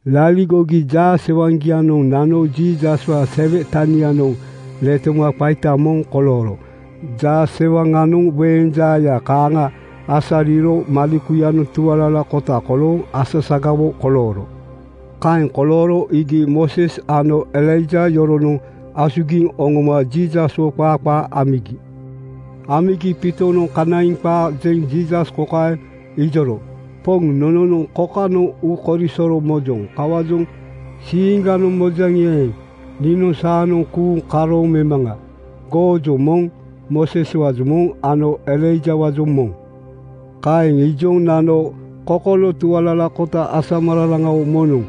Laligogi jaasewaŋgianoŋ nano Jiisaswaa sele tanianoŋ letoma qaita moŋ kolooro. Jaasewaŋanoŋ weeŋ jaaya kaaŋa asariro malekuyanoŋ tualalakota kolooŋ asasagawo kolooro. Kaeŋ kolooro iigi Mooses ano Elaija yoronoŋ asugiŋ oŋoma Jiisaswo qaa qaa amigi. Amigi Piitonoŋ kanaiŋ qaa jeŋ Jiisas kokaeŋ ijoro, “Poŋ, nononoŋ kokanoŋ uukorisoro mojoŋ. Kawaajoŋ siiŋganoŋ mojaŋi eeŋ, niinoŋ saanoŋ kuuŋ karooŋ memaŋa. Goojoŋ moŋ, Mooseswaajoŋ moŋ ano Elaijawaajoŋ moŋ.” Kaeŋ ijoŋ nano kokolo tualalakota asamararaŋawo moŋnoŋ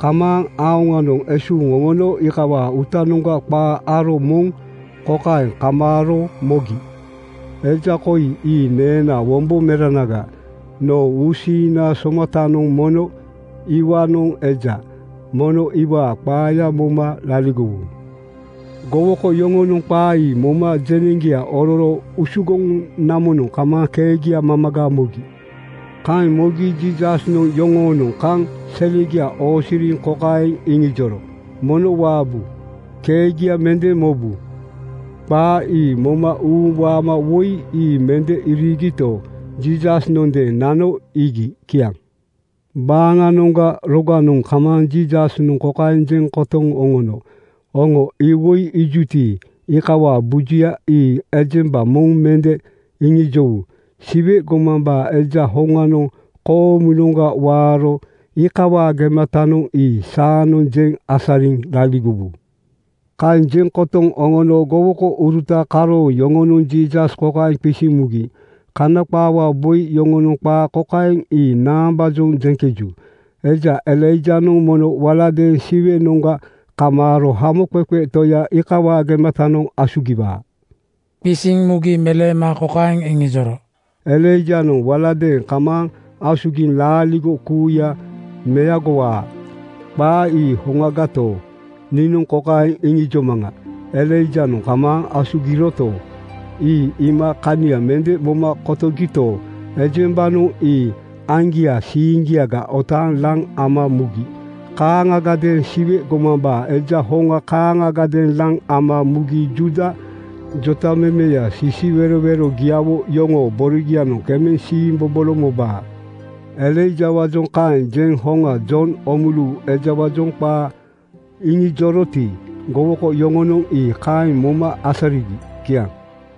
kamaaŋ aoŋanoŋ esuuŋ oŋono iikawaa uutanoŋga qa aro moŋ kokaeŋ kamaaro mogi, “Eja koi ii neenaa wombo meranaga. Noo uusiiŋna somatanoŋ mono iwaanoŋ eja. Mono iwaa qaaya moma laligowu.” Gowoko yoŋonoŋ qaa ii moma jeneŋgia ororo usugoŋ namonoŋ kamaaŋ keegia mamaga mogi. Kaeŋ mogi Jiisasnoŋ yoŋoonoŋ kaŋ selegia oosiriŋ kokaeŋ iŋijoro, “Mono waabu. Keegia mende mobu.” Qaa ii moma uuŋ waama woi ii mende iriigito, Jiisasnondeeŋ nano iigi. Kiaŋ. Baaŋanoŋga roganoŋ kamaaŋ Jiisasnoŋ kokaeŋ jeŋ kotoŋ oŋono, “Oŋo iwoi iijuti, iikawaa bujuya ii ejemba moŋ mende iŋijowu. Siwe gomambaa Eja hoŋanoŋ koomunoŋga waaro iikawaa gematanoŋ ii saanoŋ jeŋ asariŋ laligowu.” Kaeŋ jeŋ kotoŋ oŋono gowokouruta karooŋ yoŋonoŋ Jiisas kokaeŋ qisiŋ mugi, “Kana qaawaa boi yoŋonoŋ qaa kokaeŋ ii naambaajoŋ jeŋkeju, ‘Eja Elaijanoŋ mono waladeeŋ Siwenoŋga kamaaro Hamoqeqe Toyanoŋ iikawaa gematanoŋ asugiwaa?” ’ Qisiŋ mugi meleema kokaeŋ iŋijoro, “Elaijanoŋ waladeeŋ kamaaŋ asugiŋ laaligo kuuya meagowaa. Qaa ii hoŋagato, niinoŋ kokaeŋ iŋijomaŋa: Elaijanoŋ kamaaŋ asugiroto, ii iima kania mende moma kotogito, ejembanoŋ ii aŋgiaa siiŋgia otaaŋ laŋ ama mugi. Kaaŋiadeeŋ Siwe gomambaa Eja hoŋa kaaŋagadeeŋ laŋ ama mugi Juuda jotamemeya sisiwerowerogiawo yoŋoo borogianoŋ kemeŋ siimbobolo mobaa.” Elaijawaajoŋ kaeŋ jeŋ hoŋa Jon Oomulu ejawaajoŋ qaa iŋijoroti, gowoko yoŋonoŋ ii kaeŋ moma asarigi. Kiaŋ.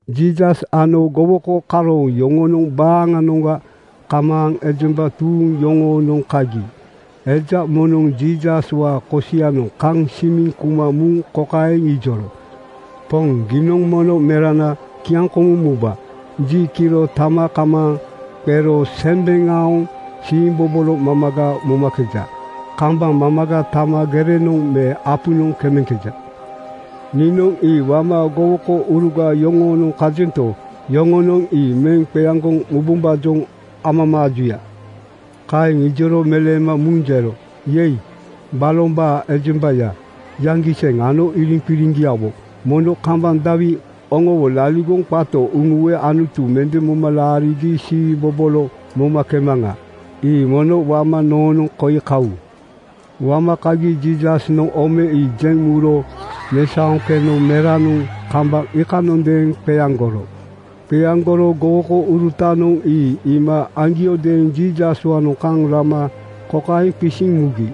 Jiisas ano gowoko karooŋ yoŋonoŋ baaŋanoŋga kamaaŋ ejemba tuuŋ yoŋoonoŋ kagi eja moŋnoŋ Jiisaswaa kosianoŋ kaŋ simiŋ kuma muŋ kokaeŋ ijoro, “Poŋ, giinoŋ mono merana kiaŋkomuŋ muba. Ji kiro tama kamaaŋ qero sembeŋ aoŋ siimbobolo mamaga momakeja. Kambaŋ mamaga tama gerenoŋ me apunoŋ kemeŋkeja. Niinoŋ ii wama gowokouruga yoŋoonoŋ kajento, yoŋonoŋ ii meŋ qeaŋgoŋ mubombaajoŋ amamaajuya.” Kaeŋ ijoro meleema muŋ jero, “Yei! Balombaa ejemba yaŋgiseŋ ano iriŋqiriŋgiawo, mono kambaŋ dawi oŋowo laligoŋ qato uŋuwe Anutu mende moma laarigi siimbobolo momakemaŋa? Ii mono wama noonoŋ koi kawu.” Wama kagi Jiisasnoŋ ome ii jeŋ muro mesaoŋ keno meranoŋ kambaŋ iikanondeeŋ qeaŋgoro. Qeaŋgoro gowokourutanoŋ ii iima aŋgiodeeŋ Jiisaswaanoŋ kaŋ rama kokaeŋ qisiŋ mugi,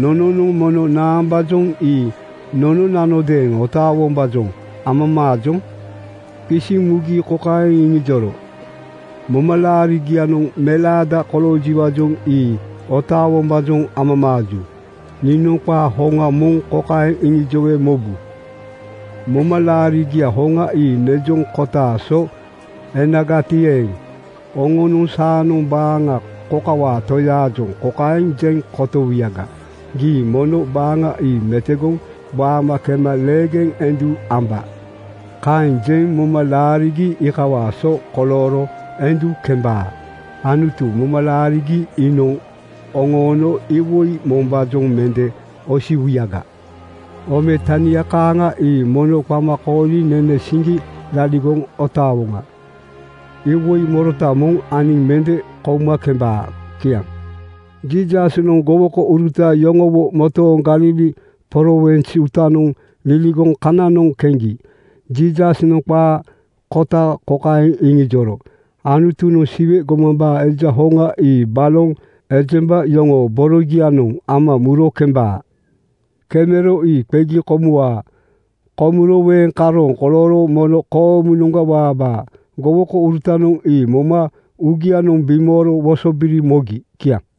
“Nononoŋ mono naambaajoŋ ii nononanodeeŋ otaawombaajoŋ amamaajoŋ?” Qisiŋ mugi kokaeŋ iŋijoro, “Momalaarigianoŋ melaada koloojiwaajoŋ ii otaawombaajoŋ amamaaju. Niinoŋ qaa hoŋa moŋ kokaeŋ iŋijowe mobu: Momalaarigiaa hoŋa ii nejoŋ kotaa so enagati eeŋ, oŋonoŋ saanoŋ baaŋa kokawaa Toyaajoŋ kokaeŋ jeŋ kotowuyaga, ‘Gii mono baaŋa ii metogoŋ waama kema leegeŋ endu amba.’ Kaeŋ jeŋ moma laarigi iikawaa so kolooro endu kembaa. Anutu moma laarigi inaaŋ oŋono iwoi mombaajoŋ mende osiwuyaga.” (Ome tania kaaŋa ii mono qama kooliŋ nene siŋgi laligoŋ otaawoŋa. Iwoi morota moŋ aniŋ mende kouma kembaa. Kiaŋ.) Jiisasnoŋ gowokouruta yoŋowo motooŋ Galili prowins uutanoŋ liligoŋ kananoŋ keŋgi Jiisasnoŋ qaa kota kokaeŋ iŋijoro, “Anutunoŋ Siwe gomambaa Eja hoŋa ii baloŋ ejemba yoŋoo borogianoŋ ama muro kemebaa. Kemero ii qegi komuwaa. Komuro weeŋ karooŋ kolooro mono koomunoŋga waabaa.” Gowokourutanoŋ ii moma uugianoŋ bimooro wosobiri mogi. Kiaŋ.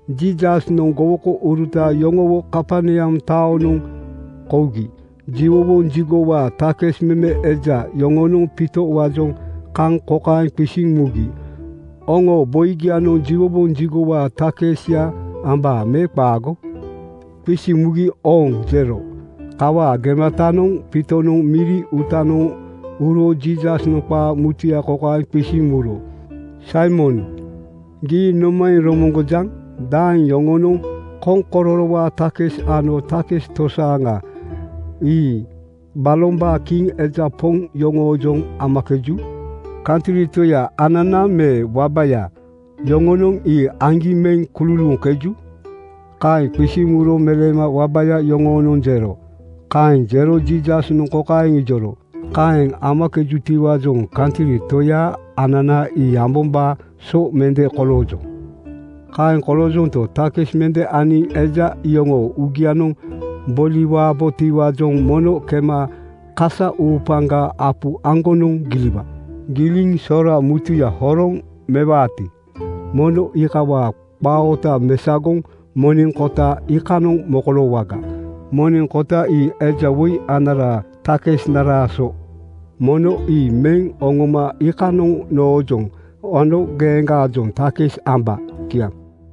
Jiisasnoŋ gowokouruta yoŋowo Kaperneam taonoŋ kougi jiwowoŋ jigowaa takis meme eja yoŋonoŋ Piitowaanoŋ kaŋ kokaeŋ qisiŋ mugi, “Oŋoo boigianoŋ jiwowoŋ jigowaa takisya ambaa me qaago?” Qisiŋ mugi “Ooŋ!” jero. Kawaa gematanoŋ Piitonoŋ miri uutanoŋ uro Jiisasnoŋ qaa mutuya kokaeŋ qisiŋ muro, “Saimon, gii nomaeŋ romoŋgojaŋ? Daeŋ yoŋonoŋ koŋkororowaa takis ano takis tosaaŋa (custom, revenue) ii balombaa kiŋ eja poŋ yoŋoojoŋ amakeju? Kantri toya anana me wabaya yoŋonoŋ ii aŋgi meŋ kululuuŋkeju?” Kaeŋ qisiŋ muro meleema “Wabaya yoŋonoŋ,” jero. Kaeŋ jero Jiisasnoŋ kokaeŋ ijoro, “Kaeŋ amakejutiwaajoŋ kantri toya anana ii ambombaa so mende koloojoŋ. Kaeŋ koloojonto, takis mende aniŋ eja iyoŋoo uugianoŋ boliwabotiwaajoŋ mono kema kasa uupaŋga apu aŋgonoŋ giliwa. Giliŋ sora mutuya horoŋ mewaati, mono iikawaa qaa oota mesagoŋ moneŋ kota iikanoŋ mokoloowaga. Moneŋ kota ii eja woi anaraa takisnaraa so. Mono ii meŋ oŋoma iikanoŋ noojoŋ ano geeŋgaajoŋ takis amba.” Kiaŋ.